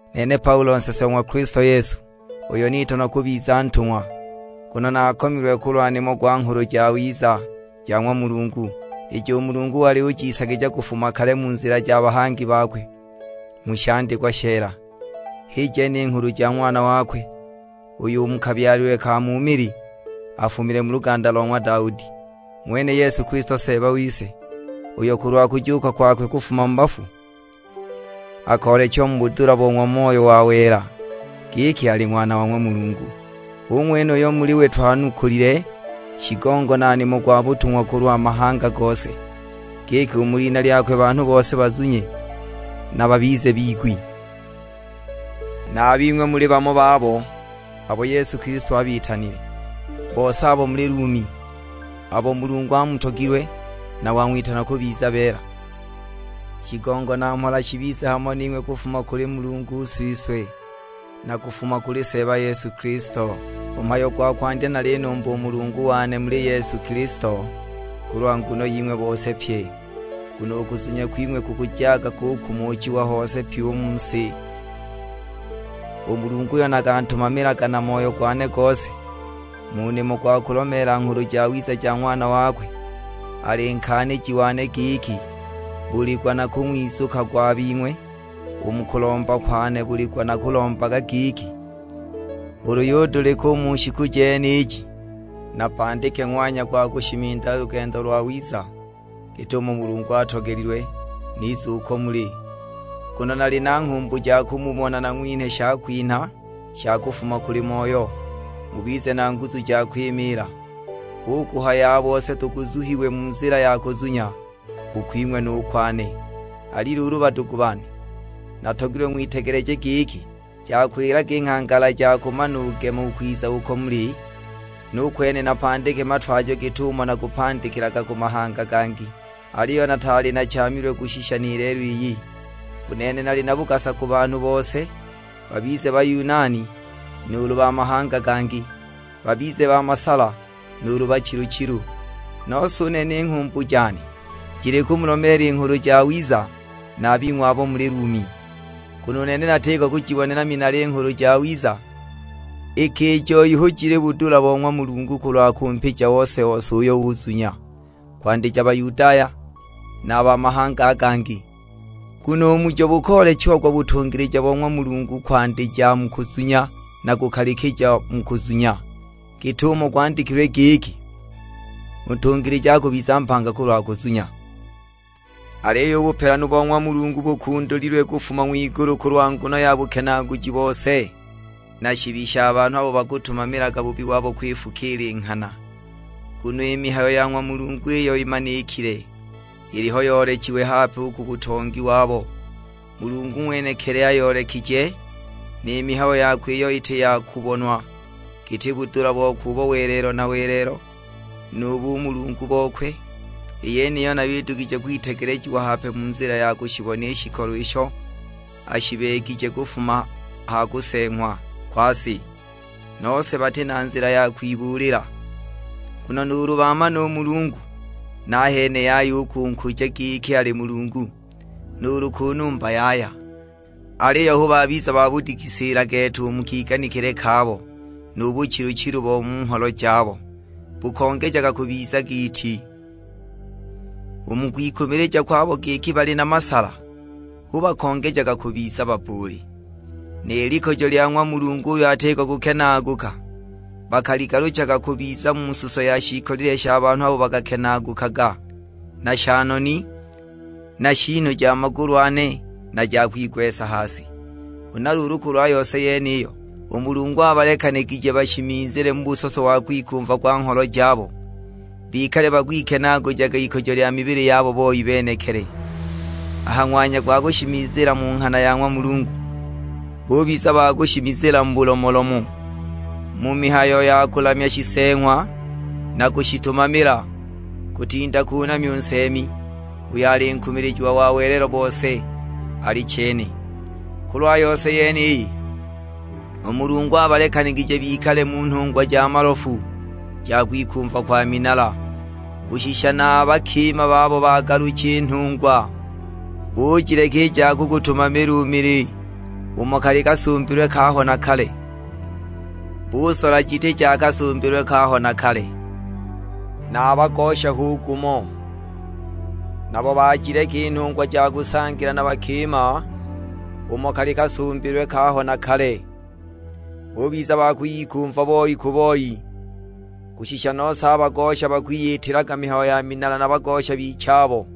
Nene Paulo nsese o ng'wa Kilisto Yesu, uyo nitanwa kubiza ntung'wa, nguno nakomilwe kulwa nimo gwa Nghulu Jawiza ja ng'wa Mulungu, ijo u Mulungu wali wajiisagija kufuma kale mu nzila ya bahangi bakwe, mu shandikwa sheela. H'i jene i nghulu ja Ng'wana wakwe, uyo u mu kabyalilwe ka mu mili afumile mu luganda lo ng'wa Daudi, ng'wene Yesu Kilisto Seeba wise, uyo kulwa kujuuka kwakwe kufuma mu bafu, akoolechiwa mu budula bo ng'wa Moyo wa wela, giki ali Ng'wana wa ng'wa Mulungu. Hu ng'wene uyo muli we twanukulile shigongo na nimo gwa butung'wa kulwa mahanga gose; giki u mu lina lyakwe banhu bose bazunye na babize bigwi. Na a bing'we muli bamo babo, abo Yesu Kilisto abitanile; bose abo muli Lumi, abo Mulungu amutogilwe, na wang'witana kubiza beela: Shigongo na mhola shibize hamo ning'we kufuma kuli Mulungu Siswe, na kufuma kuli Seeba Yesu Kilisto. U mhayo gwa kwandya nalinumba u Mulungu wane muli Yesu Kilisto kulwa nguno ying'we bose pye, nguno u kuzunya kwing'we kukujaga kukumuchiwa hose pyi u mu si. U Mulungu uyo nakantumamilaga na moyo gwane gose mu nimo gwa kulomeela Nghulu Jawiza ja Ng'wana wakwe, ali nkaaniji wane giki buli gwa nakung'wizukagwa a bing'we. U mu kulomba kwane buli gwa nakulombaga giki, ulu yudulika u mu shiku jeniji, napandike ng'wanya gwa kushimiza lugendo lwawiza git'umo Mulungu atogelilwe, nize uko muli. Nguno nali na nghumbu ja kumubona nang'winhe shakwinha sha kufuma kuli Moyo, mubize na nguzu ja kwimiila. Hu kuhaya a bose tuguzuhiwe mu nzila ya kuzunya: u kwing'we nu kwane. Ali luulu badugu bane, natogilwe ng'witegeleje giki, jakwilaga i nghangala ja kumanugema u kwiza uko muli, nu kwene napandike matwajo git'umo nakupandikilaga ku mahanga gangi; aliyo nataali nachaamilwe kushisha ni lelo iyi. U nene nali na bugasa ku banhu bose, babize Bayunani nuulu ba mahanga gangi; babize ba masala nuulu bachilu-chilu. Nose u nene i nghumbu jane, jili kumulomeela i Nghulu Jawiza na a bing'we abo muli Lumi. Nguno u nene natiko kujibonela minala i Nghulu Jawiza, iki i joi hu jili budula bo ng'wa Mulungu kulwa kumpija ose-ose uyo uzunya; kwandija Bayudaya, na a ba mahanga a gangi. Nguno u mujo bukoolechiagwa butungilija bo ng'wa Mulungu, kwandija mu kuzunya na kukalikija mu kuzunya, git'umo gwandikilwe giki, "U ntungilija akubiza mpanga kulwa kuzunya." Aliyo u bupelanu bo ng'wa Mulungu bukundulililwe kufuma ng'wigulu kulwa nguno ya bukenaaguji bose, na shibi sha banhu abo bakatumamilaga bubi wabo kwifukiila i nghana. Nguno i mihayo ya ng'wa Mulungu iyo imanikile, iliho yoolechiwe hape u ku butongi wabo, Mulungu ng'wenekili ayoolekije. Ni mihayo yakwe iyo iti ya kubonwa, giti budula bokwe u bo welelo na welelo, nu bumulungu bokwe; i yeniyo nayo idugije kwitegelejiwa hape mu nzila ya kushibona i shikolo isho ashibeegije kufuma ha kuseeng'wa kwa si. Nose bati na nzila ya kwibuulila! Nguno nuulu baamana u Mulungu, nahene yaya u kunkuja giki ali Mulungu, nuulu kunumba yaya. Aliyo hu babiza babudigisiila gete u mu kiganikile kabo, nu buchilu-chilu bo mu ngholo jabo bukongejaga kubiza giiti! U mu kwikumilija kwabo giki bali na masala, hu bakongejaga kubiza babbuuli. Ni likujo lya ng'wa Mulungu uyo atiko kukenaaguka, bakaligaluchaga kubiza mu suso ya shiikolile sha banhu abo bakakenaagukaga, na sha noni, na shiinu ja magulu ane na ja kwigwesa ha si. Huna luulu kulwa yose yeniyo, u Mulungu abalekanigije bashimizile mu busoso wa kwikumva kwa ngholo jabo, bikale bakwikenaagujaga ikujo lya mibili yabo boi benekili. A ha ng'wanya gwa kushimizila mu nghana ya ng'wa Mulungu, bubiza ba kushimizila mu bulomolomo, mu mihayo ya kulamya shiseeng'wa na kushitumamila, kutinda kunamya u Nseemi, uyo ali nkumilijiwa wa welelo bose: Alichene. Kulwa yose yeniyi, u Mulungu abalekanigije bikale mu nhungwa ja malofu ja kwikumva kwa minala. Kushisha na a bakima babo bagalucha i nhungwa, bujileka i ja kugutumamila u mili umo kali kasumbilwe kaaho na kale, busola jiti ja kasumbilwe kaaho na kale. Na a bagosha hu gumo, nabo bajileka i nhungwa ja kusangila na bakima umo kali kasumbilwe kaaho na kale, bubiza ba kwiyikumva boi ku boi. Kushisha nose bagosha bakwiyitilaga mihayo ya minala na bagosha bichabo;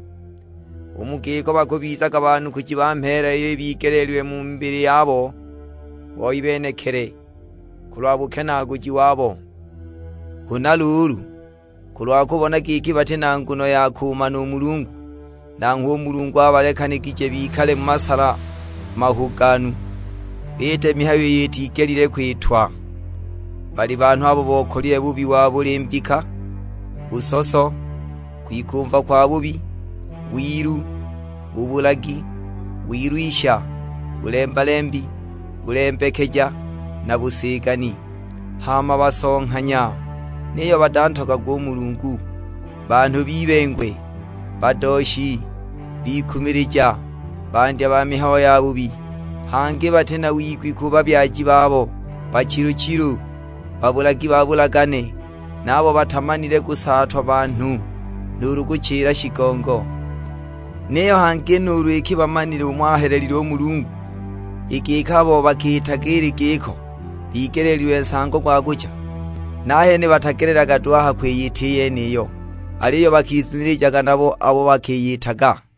u mu giko bakubizaga baanukuji ba mheela iyo ibigeleelilwe mu mibili yabo boi benekili, kulwa bukenaaguji wabo! Huna luulu, kulwa kubona giki bati na nguno ya kumana u Mulungu, nanghwe u Mulungu abalekanigije bikale mu masala mahuganu, biite mihayo iyo itigelile kwitwa. Bali banhu abo bokalile bubi wa buli mbika, busoso, kwikumva kwabubi, wilu, bubulagi, wilwisha, bulemba-lembi, bulembekeja, na busigani. Hama basonghanya, niyo batantogagwa u Mulungu. Banhu b'ibengwe, badooshi, bikumilija, bandya ba mihayo yabubi, hangi bati na wigwi ku babyaji babo. Bachilu-chilu, babulagi ba bulagane, naabo batamanile kusaatwa banhu, nuulu kuchila shigongo. Niyo hangi nuulu iki bamanile umo ahelelile u Mulungu, i giki abo bakiitaga ili giko bigeleelilwe nsango gwa kucha, nahene batagelelaga duhu a ha kwiyita i yeniyo, aliyo bakizunilijaga nabo abo bakiyitaga!